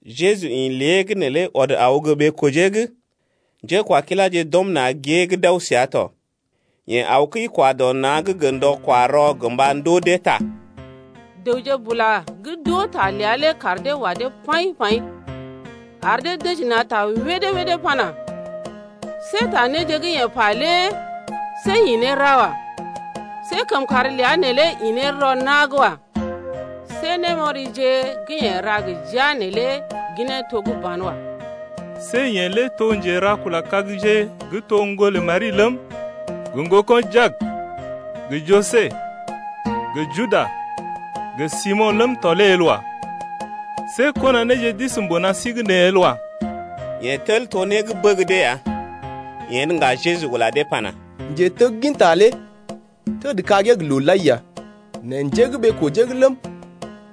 Jeju ḭ lée’g neelé ɔd aw gə́ ɓee-kojee’g. Njékwakiláje d’ɔm na̰ gée’g d’aw səa tɔ. Yeḛ aw kəi-kwa-dɔ-na̰’g gə ndɔ-kwa-rɔ gə mba ndoo dee ta. Dəwje bula gə́ d’oo ta ləa lé kaar dee wa dee paḭ-paḭ ar dee dəji na̰ ta wédé-wédé pana, see ta néje gə́ yeḛ pa lé see ḭ ne ra wa. See kəmkàr ləa neelé ḭ ne rɔ na̰’g wa. See némɔrije gə́ yeḛ ra gə jia neelé ginee to gə́ banwa. See yeḛ lé to njera-kula-kagje gə́ to ŋgolə Mari ləm, gə ŋgoko̰ Jak gə Joses gə Juda gə Simo̰ ləm tɔ lé el wa. See kɔnaneeje d’isi mbuna sí’g nee el wa. Yeḛ tel to né gə́ bəg dee ya. Yen ŋga Jeju ula dee pana: Njetegginta lé njé gə́ ɓee-kojee’g ləm,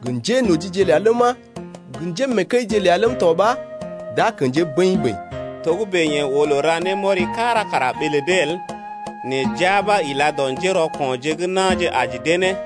gə njénojije ləa ləma, gə njé gə́ mee kəije ləm tɔ ɓa d’a kḛjee bəḭ-bəḭ ya. Togə́bè yeḛ oo loo ra némɔri kára kara ɓee lə dee el, nɛ jia ɓa ila dɔ njérɔko̰je gə́ na̰je aji dee ne.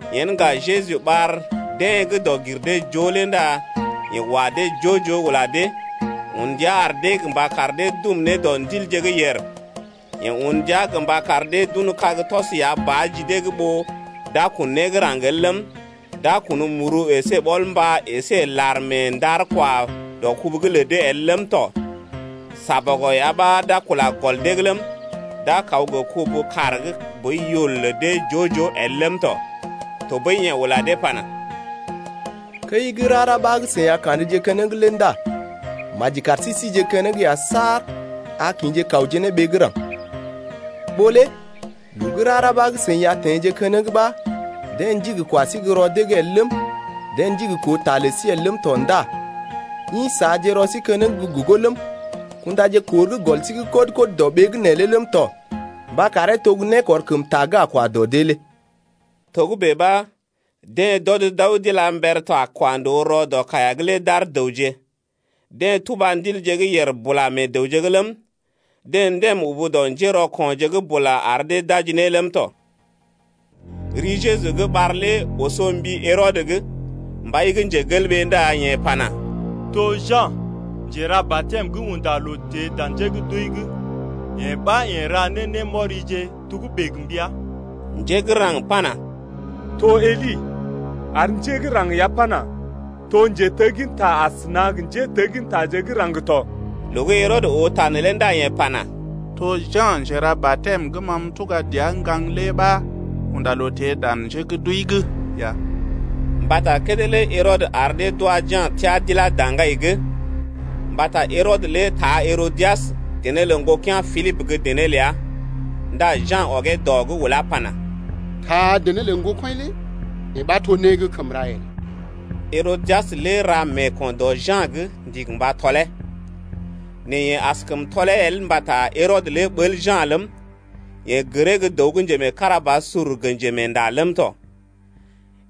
Yen ŋga Jeju ɓar deḛ gə́ dɔg-gir-dee-joo lé ndá yeḛ wa dee joo-joo ula dee, un ndia ar dee gə mba kar dee dum ne dɔ ndilje gə́ yèr. Yeḛ un ndia gə mba kar dee d’un kag tɔs ya ba ji dee’g ɓó d’a kun né gə́ raŋg el ləm, d’a kun muru əsé ɓɔl-mbá əsé lar mee ndar-kwa-dɔ-kubuje’g lə dee el ləm tɔ. Négɔl ya ɓa d’a kula gɔl dee’g ləm, d’a kaw gə kubu-kaar gə́ boi yul lə dee joo-joo el ləm tɔ. Tɔɓəi yeḛ ula dee pana: Kəi gə́ rara ɓa gə́ seḭ a ka̰dje keneŋ lé ndá maji kar si síje keneŋ ya saar a kḭje kawje ne ɓee gə́ raŋg. Ɓó lé loo gə́ rara ɓa gə́ seḭ a teḛje keneŋ ɓa deḛ ndigi kwa sí gə́ rɔ dee’g el ləm, deḛ ndigi koo ta lə sí el ləm tɔ ndá ḭ saaje rɔ sí keneŋ gə́ gogo ləm, kundaje kor gə́ gɔl sí’g kɔd-kɔd dɔ ɓee’g neelé ləm tɔ mba karee to gə́ nékɔrkəmta gə́ a kwa dɔ dee lé kɔmje dɔ dee’g. Togə́bè ɓa deḛ d’ɔd d’aw d’ila mber ta kwa ndòo rɔ dɔ kaiya’g lé d’ar dəwje. Deḛ tuba ndilje gə́ yèr bula meḛ dəwje’g ləm, deḛ ndəm ubu dɔ njérɔko̰je’g bula ar dee d’aji ne ləm tɔ. Ri Jeju gə́ ɓar lé oso mbi Herɔdə’g, mbai lé ndá yeḛ pana: To Ja̰ Njera-batɛm gə́ unda loo teḛ dan njé gə́ d’wəi’g, yee ɓa yeḛ ra ne némɔrije togə́bè gə mbəa. Njé gə́ raŋg pana: To Eli. Ar njé gə́ raŋg ya pana: To njetegginta asəna gə njéteggintaje gə́ raŋg tɔ. Loo gə́ Herɔdə oo ta neelé ndá yeḛ pana: To Ja̰ Njera-batɛm gə́ ma m’tuga dəa m’gaŋg lé ɓa unda loo teḛ dan njé gə́ d’wəi’g ya. Mbata kédé lé Herɔdə ar dee d’wa Ja̰ teá d’ilá daŋgai’g. Mbata Herɔdə lé taa Herodias, dené lə ŋgokea̰ Pilibə gə́ dené ləa ndá Ja̰ ɔgee dɔ’g ulá pana: Taa dené lə ŋgokɔḭ lé yee ɓa to né gə́ kəm ra el. Herodias lé ra meeko̰ dɔ Ja̰’g, ndigi mba tɔlee. Nɛ yeḛ askəm tɔlee el mbata Herɔdə lé ɓəl Ja̰ ləm, yeḛ gəree gə́ dəw gə́ njemeekarabasur gə njemeenda ləm tɔ.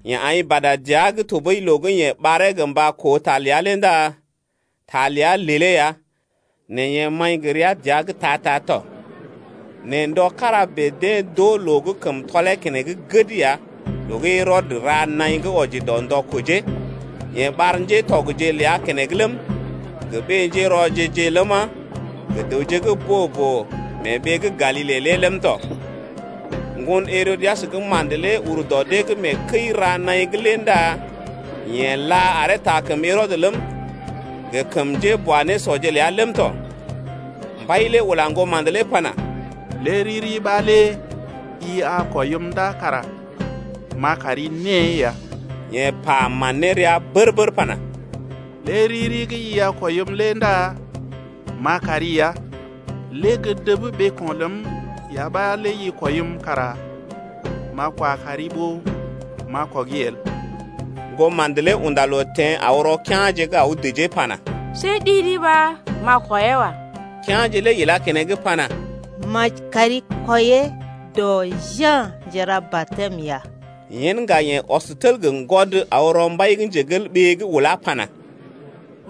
Yeḛ aḭ bada dəa’g tɔɓəi loo gə́ yeḛ ɓaree gə mba koo ta ləa lé ndá ta ləa lelee ya nɛ yeḛ maḭ gə́ rəa dəa’g ta-ta tɔ. Nɛ ndɔ kára bèe deḛ d’oo loo gə́ kəm tɔlee keneŋ gəd ya loo gə́ Herɔdə ra naḭ gə́ wɔji dɔ ndɔ kojee, yeḛ ɓar ŋgatɔgje ləa keneŋ ləm, gə ɓé-njérɔje-je ləma, gə dəwje gə́ boo-boo mee ɓee gə́ Galile lé ləm tɔ. Ŋgon Herodias gə́ ma̰də lé ur dɔ dee’g mee kəi-ra-naḭ’g lé ndá yeḛ là aree taa kəm Herɔdə ləm, gə kəm njéboanésɔje ləa ləm tɔ. Mbai lé ula ŋgoma̰də lé pana: Lé riri ɓa lé i a kwɔim ndá kara m’a kari née ya. Yeḛ pa man ne rəa bər-bər pana: Lé riri gə́ i a kwɔim lé ndá m’a kari ya. Lé gə́ dəb ɓeeko̰ ləm ya ɓa lé dəjim kara m’a kwa kari ya ɓó m’a kɔgi el. Ŋgoma̰də lé unda loo teḛ aw rɔ kea̰je’g aw dəjee pana: See ɗi-ɗi ɓa m’a dəjee wa. Kea̰je lé ilá keneŋ pana: Maji kari dəjee dɔ Ja̰ Njera-batɛm ya. Yen ŋga yeḛ ɔs tel gə́ ŋgwɔd aw rɔ mbai’g ulá pana: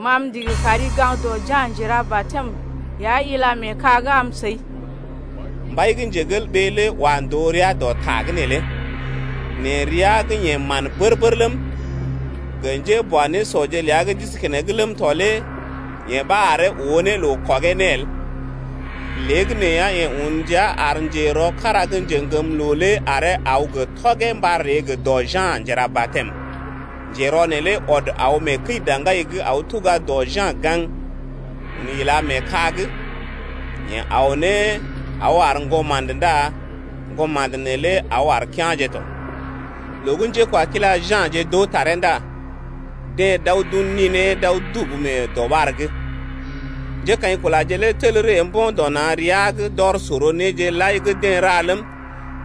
Ma m’ndigi kari gaŋg dɔ Ja̰ Njera-batɛm ya ila mee ka’g am səi. Mbai lé wa ndòo rəa dɔ ta’g neelé, nɛ rəa gə́ yeḛ man bər-bər ləm, gə njéboanésɔje ləa gə́ d’isi keneŋ ləm tɔ lé yee ɓa aree oo ne loo kɔgee ne el. Léegəneeya, yeḛ un ndia ar njerɔ kára gə́ njeŋgəmloo lé aree aw gə tɔgee mba ree gə dɔ Ja̰ Njera-batɛm lé. Njerɔ neelé ɔd aw mee kəi-daŋgai’g aw tuga dɔ Ja̰ gaŋg, un ila mee ka’g. Yeḛ aw ne aw ar ŋgoma̰də ndá ŋgoma̰də neelé aw ar kea̰je tɔ. Loo gə́ njékwakila Ja̰je d’oo taree ndá deḛ d’aw d’un ninee d’aw dubu mee dɔɓar’g. Njékaḭkulaje lé tel ree mbo̰ dɔ na̰ rəa’g d’ɔr sor néje lai gə́ deḛ ra ləm,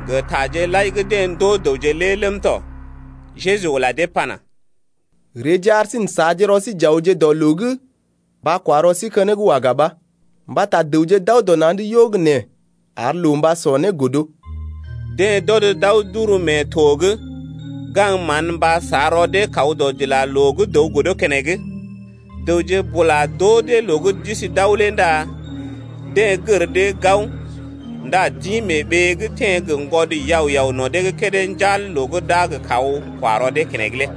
gə taje lai gə́ deḛ ndoo dəwje lé ləm tɔ. Jeju ula dee pana: Reeje ar sí n’saaje rɔ sí j’awje dɔ loo’g mba kwa rɔ sí keneŋ waga ɓa. Mbata dəwje d’aw dɔ na̰’d yo gə́ nee ar loo mba sɔ né godo. Deḛ d’ɔd d’aw d’uru mee to’g, gaŋg mán mba sa rɔ dee kaw dɔdilaloo gə́ dəw godo keneŋ. Dəwje bula d’oo dee loo gə́ d’isi d’aw lé ndá deḛ gər dee gao ndá d’ḭ mee ɓee’g teḛ gə ŋgwɔd yao-yao no̰ dee’g kédé njal loo gə́ d’a gə kaw kwa rɔ dee keneŋ lé.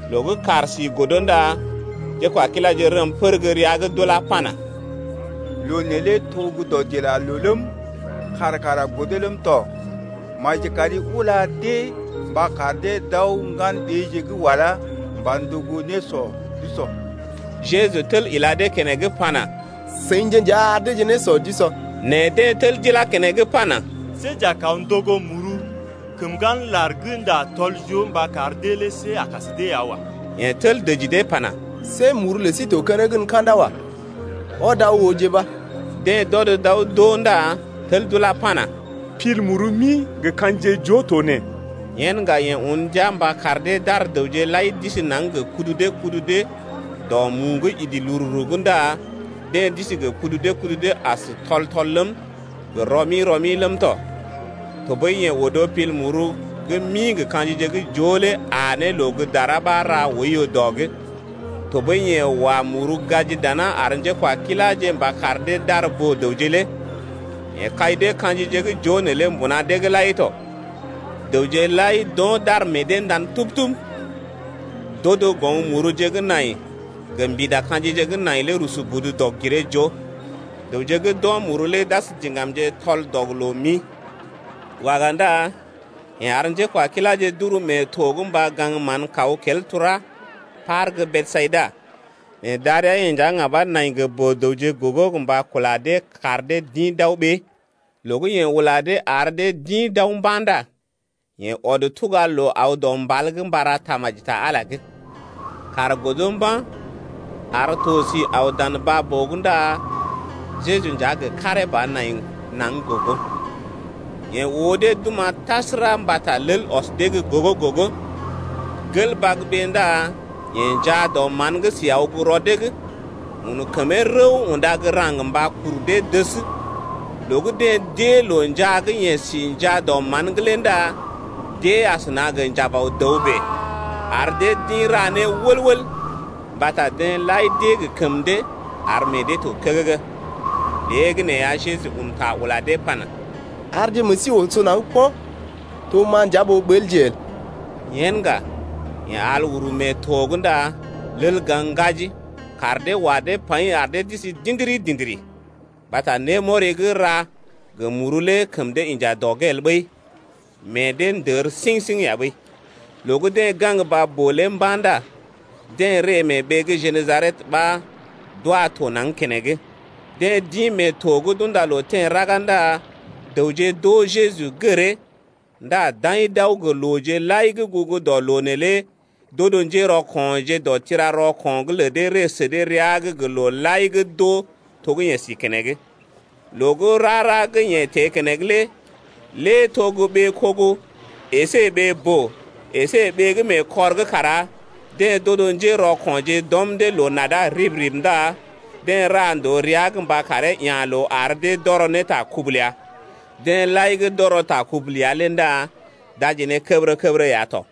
Loo gə́ kàr si godo ndá njékwakiláje rəm pər gə́ rəa’g d’ulá pana: Loo neelé to gə́ dɔdilaloo ləm, kàr kara godo ləm tɔ. Maji kari ula dee mba kar dee d’aw ŋgan-ɓeeje gə́ walá mba ndogo nésɔ d’usɔ. Jeju tel ila dee keneŋ pana: Seḭje nja ar deeje nésɔ d’usɔ. Nɛ deḛ tel d’ilá keneŋ pana: See j’a kaw ndogo muru kəm ŋgan lar gə́ ndá tɔl-joo mba kar dee lé see a kas dee ya wa. Yeḛ tel dəji dee pana: See muru lə sí to keneŋ gən ka̰da wa. Ɔdje aw ooje ɓa. Deḛ d’ɔd d’aw d’oo ndá tel d’ulá pana: Pil muru mi gə ka̰jije joo to nee. Yen ŋga yeḛ un ndia mba kar dee d’ar dəwje lai d’isi naŋg gə kudu dee kudu dee dɔ mu gə́ idi lururu’g ndá deḛ d’isi gə kudu dee kudu dee as tɔl-tɔl ləm, gə rɔ-mi rɔ-mi ləm tɔ. Tɔɓəi yeḛ odo pil muru gə́ mi gə ka̰jije gə́ joo lé aa ne loo gə́ dara ɓa ra oiyo dɔ’g. Tɔɓəi yeḛ wa muru gaji dana ar njékwakiláje mba kar dee d’ar boo-dəwje lé. Yeḛ kai dee ka̰jije gə́ joo neelé mbuna dee’g lai tɔ. Dəwje lai d’o̰ d’ar meḛ dee ndan tub-tub. D’odo goŋ muruje gə́ nai gə mbida ka̰jije gə́ nai lé rusu budu dɔg-giree-joo. Dəwje gə́ d’o̰ muru lé d’as diŋgamje tɔl-dɔg-loo-mi. Waga ndá yeḛ ar njékwakiláje d’uru mee to’g mba gaŋg mán kaw kel tura par gə́ Besayida, nɛ darəa-yeḛ nja ŋga ɓa nai gə boo-dəwje gogo gə mba kula dee kar dee d’ḭ d’aw ɓee. Loo gə́ yeḛ ula dee ar dee d’ḭ d’aw mba̰ ndá yeḛ ɔd tuga loo aw dɔ mbal’g mba ra tamaji ta Ala’g. Kàr godo mba̰, ar to sí aw dan baa-boo’g ndá Jeju nja gə karee ba nai naŋg gogo. Yeḛ oo dee d’oma̰ tasəra mbata lel ɔs dee gə́ gogo-gogo. Gel bagbé ndá yeḛ njaa dɔ mán’g si aw gə́ rɔ dee’g, un kəmee rəw unda gə́ raŋg mba kuru dee dəs. Loo gə́ deḛ d’ée loo njaa gə́ yeḛ si njaa dɔ mán’g lé ndá d’ée asəna gə njabaw-dəw bèe, ar dee d’ḭ ra ne wəl-wəl mbata deḛ lai d’ée gə kəm dee ar meḛ dee to kəgəgə. Léegəneeya, Jeju un ta ula dee pana: Arje meḛ sí oso naŋg po̰, to ma nja ɓó ɓəlje el. Yen ŋga yeḛ al uru mee to’g ndá lel gaŋg ŋgaji. Kaar dee wa dee paḭ ar dee d’isi dḭdiri-dḭdiri, mbata némɔri gə́ ra gə muru lé kəm dee inja dɔ’g el ɓəi, meḛ dee ndər siŋ-siŋ ya ɓəi. Loo gə́ deḛ gaŋg baa-boo lé mba̰ ndá deḛ ree mee ɓee gə́ Jenesaret ɓa deḛ d’wa to naŋg keneŋ. Deḛ d’ḭ mee to’g d’unda loo teḛ raga ndá dəwje d’oo Jeju gəree, ndá d’aḭ d’aw gə looje lai gə́ gugu dɔ loo neelé d’odo njérɔko̰je dɔ tira-rɔko̰’g lə dee ree sə dee rəa’g gə loo lai gə́ d’oo to gə́ yeḛ si keneŋ. Loo gə́ rara gə́ yeḛ teḛ keneŋ lé lé to gə́ ɓee-kogo əsé ɓee-boo əsé ɓee gə́ mee kɔr’g kara deḛ d’odo njérɔko̰je d’ɔm dee loo-nada rib-rib ndá deḛ ra ndòo rəa’g mba karee ya̰ loo ar dee d’ɔrɔ ta kubu ləa. Deḛ lai gə́ d’ɔrɔ ta kubu ləa lé ndá d’aji ne kəbərə-kəbərə ya tɔ.